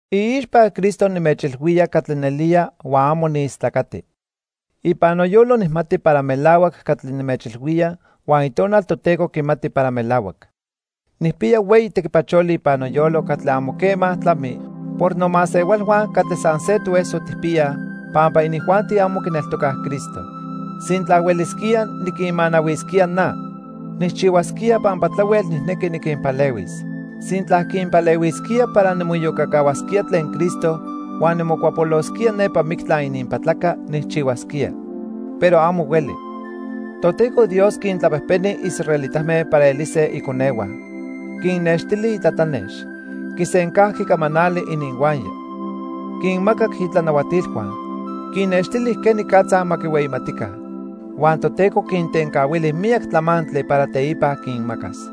Iixpa Cristo nimechilhuía catli nelía huan amo niistlacati. Ipan noyolo nijmati para melahuac catli nimechilhuía huan Itonal Toteco quimati para melahuac. Nijpiya hueyi tequipacholi ipan noyolo catli amo quema tlami por nomasehualhua catli san se toeso tijpiyaj, pampa inijuanti amo quineltocaj Cristo. Sintla huelisquía niquinmanahuisquía na, nijchihuasquía pampa tlahuel nijnequi niquinpalehuis. Sintla quinpalehuisquía para nimoiyocacahuasquía tlen Cristo huan nimocuapolosquía nepa mictla ininpatlaca, nijchihuasquía. Pero amo hueli. Toteco Dios quintlapejpeni israelitame para elise iconehua. Quinnextili itlatlanex. Quisencajqui camanali ininhuaya. Quinmacac itlanahuatilhua. Quinnextili quenicatza ma quihueyimatica. Huan Toteco quintencahuili miyac tlamantli para teipa quinmacas.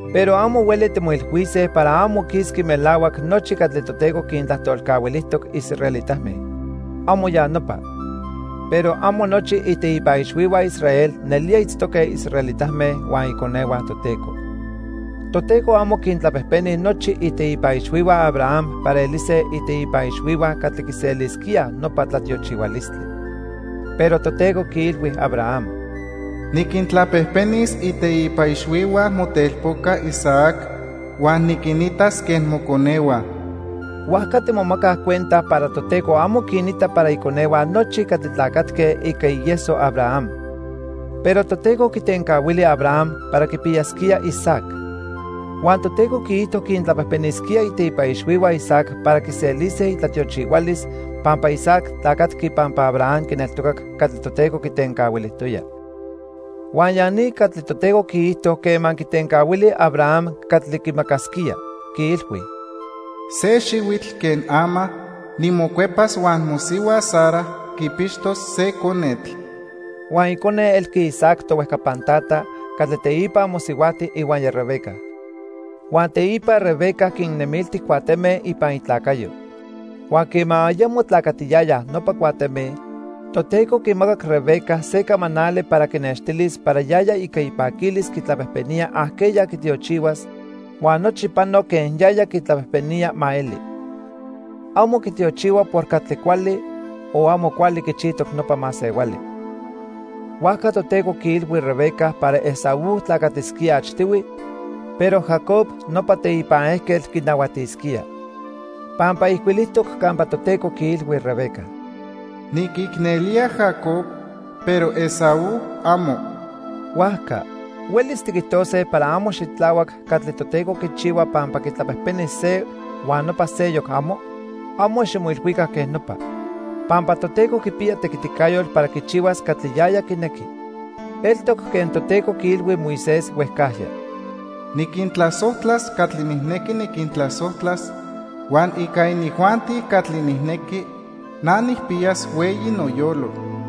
Pero amo hueli timoilhuise para amo quisqui melahuac nochi catli Toteco quintlajtolcahuilijtoc israelitame. ¡Amo ya nopa! Pero amo nochi iteipa ixhuihua Israel nelía itztoque israelitame huan iconehua Toteco. Toteco amo quintlapejpeni nochi iteipa ixhuihua Abraham para elise iteipa ixhuihua catli quiselisquíaj nopa tlatiochihualistli. Pero Toteco quiilhui Abraham: "Niquintlapejpenis iteipa ixhuihua motelpoca Isaac huan niquinitas quen moconehua." Huajca timomacaj cuenta para Toteco amo quinita para iconehua nochi catli tlacatque ica ieso Abraham. Pero Toteco quitencahuili Abraham para quipiyasquía Isaac. Huan Toteco quiijto quintlapejpenisquía iteipa ixhuihua Isaac para quiselise itlatiochihualis pampa Isaac tlacatqui pampa Abraham quineltocac catli Toteco quitencahuilijtoya. Huan ya ni catli Toteco quiijto quema quitencahuili Abraham catli quimacasquía, quiilhui: "Se xihuitl que ama nimocuepas huan mosihua Sara quipixtos se conetl." Huan icone elqui Isaac, tohuejcapan tata, catli teipa mosihuajti ihuaya Rebeca. Huan teipa Rebeca quinnemilti cuateme ipan itlacayo. Huan quema ayamo tlacatiyayaj nopa cuateme, Toteco quimacac Rebeca se camanali para quinextilis para yaya ica ipaquilis quitlapejpenía ajqueya quitiochihuas, huan nochi pano quen yaya quitlapejpenía ma eli. Amo quitiochihua por catli cuali o amo cuali quichijtoc nopa masehuali. Huajca Toteco quiilhui Rebeca para Esaú tlacatisquía achtihui, pero Jacob, nopa teipan ejquetl, quinahuatisquía. Pampa ijcuilijtoc campa Toteco quiilhui Rebeca: "Niquicnelía Jacob, pero Esaú, amo." Huajca ¿huelis tiquijtose para amo xitlahuac catli Toteco quichihua pampa quitlapejpeni se huan nopa seyoc, amo? Amo ximoilhuica quej nopa. Pampa Toteco quipiya tequiticayotl para quichihuas catli yaya quinequi. Eltoc quen Toteco quiilhui Moisés huejcajya: "Niquintlasojtlas catli nijnequi niquintlasojtlas, huan ica inijuanti catli nijnequi, na nijpiyas hueyi noyolo."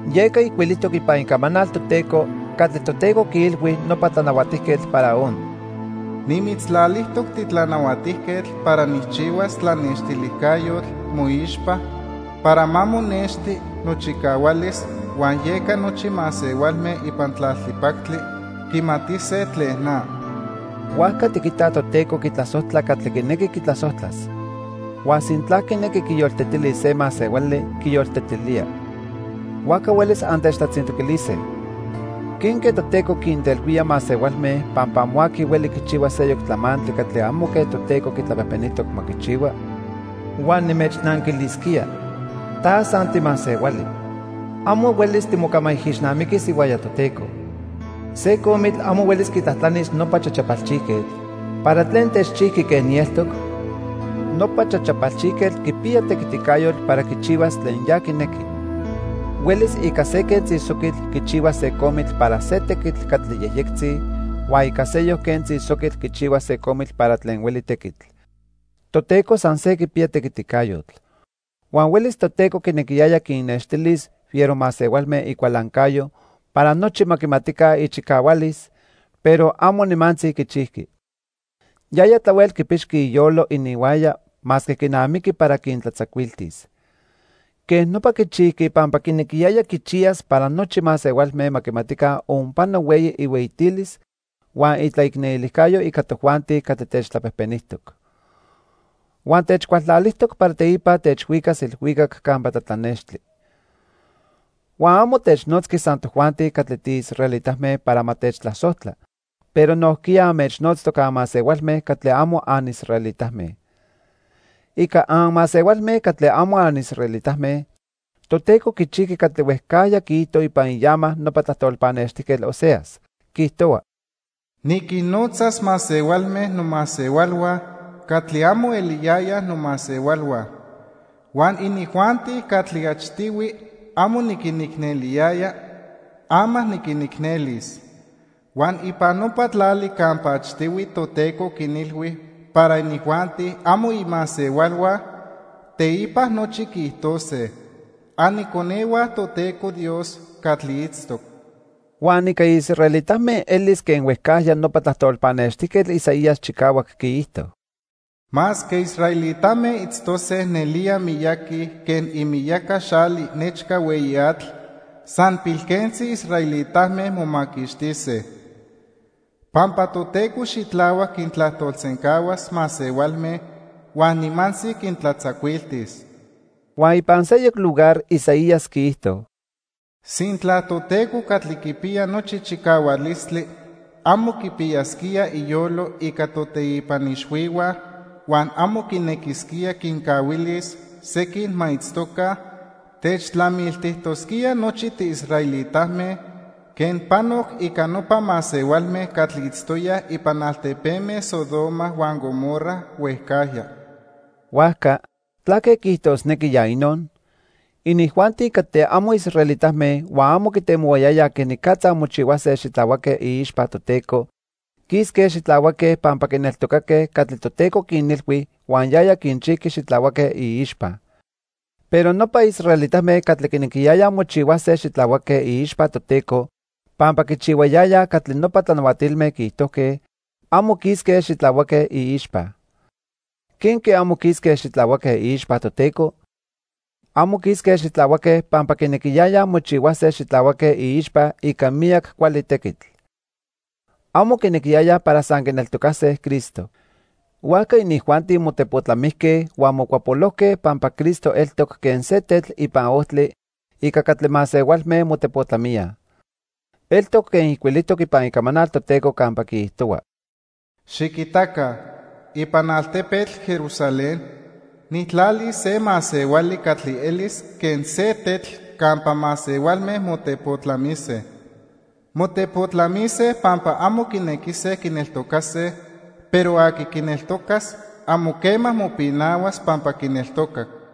Yeca ijcuilijtoc ipan Icamanal Toteco catli Toteco quiilhui nopa Tlanahuatijquetl Faraón: "Nimitztlalijtoc titlanahuatijquetl para nijchihuas tlanextilijcayotl moixpa para ma monexti nochicahualis huan yeca nochi masehualme ipan tlaltipactli quimatise tlen na." Huajca tiquitaj Toteco quitlasojtla catli quinequi quitlasojtlas. Huan sintla quinequi quiyoltetilis se masehuali, quiyoltetilía. Huajca huelis antechtlatzintoquilise: "¿Quenque Toteco quintelhuía masehualme pampa amo aqui hueli quichihua seyoc tlamantli catli amo quen Toteco quitlapejpenijtoc ma quichihua?" Huan nimechnanquilisquía: "Ta san timasehuali. Amo huelis timocamaijixnamiquis ihuaya Toteco." Se comitl amo huelis quitlajtlanis nopa chachapalchijquetl, ¿para tlen techchijqui quen nieltoc? Nopa chachapalchijquetl quipiya tequiticayotl para quichihuas tlen ya quinequi. Huelis ica se quentzi soquitl quichihuas se comitl para se tequitl catli yejyectzi huan ica seyoc quentzi soquitl quichihuas se comitl para tlen hueli tequitl. Toteco san se quipiya tequiticayotl. Huan huelis Toteco quinequiyaya quinnextilis fiero masehualme icualancayo para nochi ma quimatica ichicahualis, pero amo nimantzi quichijqui. Yaya tlahuel quipixqui iyolo ininhuaya masque quinamiqui para quintlatzacuiltis. Quej nopa quichijqui pampa quinequiyaya quichiyas para nochi masehualme ma quimatica onpano hueyi ihueyitilis huan itlaicnelijcayo ica tojuanti catli techtlapejpenijtoc. Huan techcualtlalijtoc para teipa techhuicas ilhuicac campa tlatlanextli. Huan amo technotzqui san tojuanti catli tiisraelitame para ma techtlasojtla, pero nojquiya anmechnotztoc anmasehualme catli amo anisraelitame. Ica anmasehualme catli amo anisraelitame, Toteco quichijqui catli huejcajya quiijto ipan iama nopa tlajtol pannextijquetl Oseas. Quiijtohua: "Niquinnotzas masehualme nomasehualhua catli amo eliyayaj nomasehualhua. Huan inijuanti catli achtihui amo niquinicneliyaya, ama niquinicnelis. Huan ipan nopa tlali campa achtihui Toteco quinilhui para inijuanti amo imasehualhua, teipa nochi quiijtose: 'Aniconehua Toteco Dios catli itztoc.' " Huan ica israelitame elis quen huejcajya nopa tlajtol pannextijquetl Isaías chicahuac quiijto: "Masque israelitame itztose nelía miyaqui quen imiyaca xali nechca hueyi atl, san pilquentzi israelitame momaquixtise. Pampa Toteco xitlahuac quintlajtolsencahuas masehualme huan nimantzi quintlatzacuiltis." Huan ipan seyoc lugar Isaías quiijto: "Sintla Toteco catli quipiya nochi chicahualistli amo quipiyasquía iyolo ica toteipa ixhuihua, huan amo quinequisquía quincahuilis sequin ma itztoca, techtlamiltijtosquía nochi tiisraelitame quen panoc ica nopa masehualme catli itztoyaj ipan altepeme Sodoma huan Gomorra huejcajya." Huajca ¿tlaque quiijtosnequi ya inon? Inijuanti catli amo israelitame huan amo quitemohuayayaj quenicatza mochihuase xitlahuaque iixpa Toteco, quisque xitlahuaque pampa quineltocaque catli Toteco quinilhui huan yaya quinchijqui xitlahuaque iixpa. Pero nopa israelitame catli quinequiyayaj mochihuase xitlahuaque iixpa Toteco pampa quichihuayayaj catli nopa tlanahuatilme quiijtojque, amo quisque xitlahuaque iixpa. ¿Quenque amo quisque xitlahuaque iixpa Toteco? Amo quisque xitlahuaque pampa quinequiyayaj mochihuase xitlahuaque iixpa ica miyac cuali tequitl. Amo quinequiyayaj para san quineltocase Cristo. Huajca inijuanti motepotlamijque huan mocuapolojque pampa Cristo eltoc quen se tetl ipan ojtli ica catli masehualme motepotlamíaj. Eltoc quen ijcuilijtoc ipan Icamanal Toteco campa quiijtohua: "Xiquitaca, ipan altepetl Jerusalén nijtlalis se masehuali catli elis quen se tetl campa masehualme motepotlamise. Motepotlamise pampa amo quinequise quineltocase, pero aqui quineltocas amo quema mopinahuas pampa quineltocac."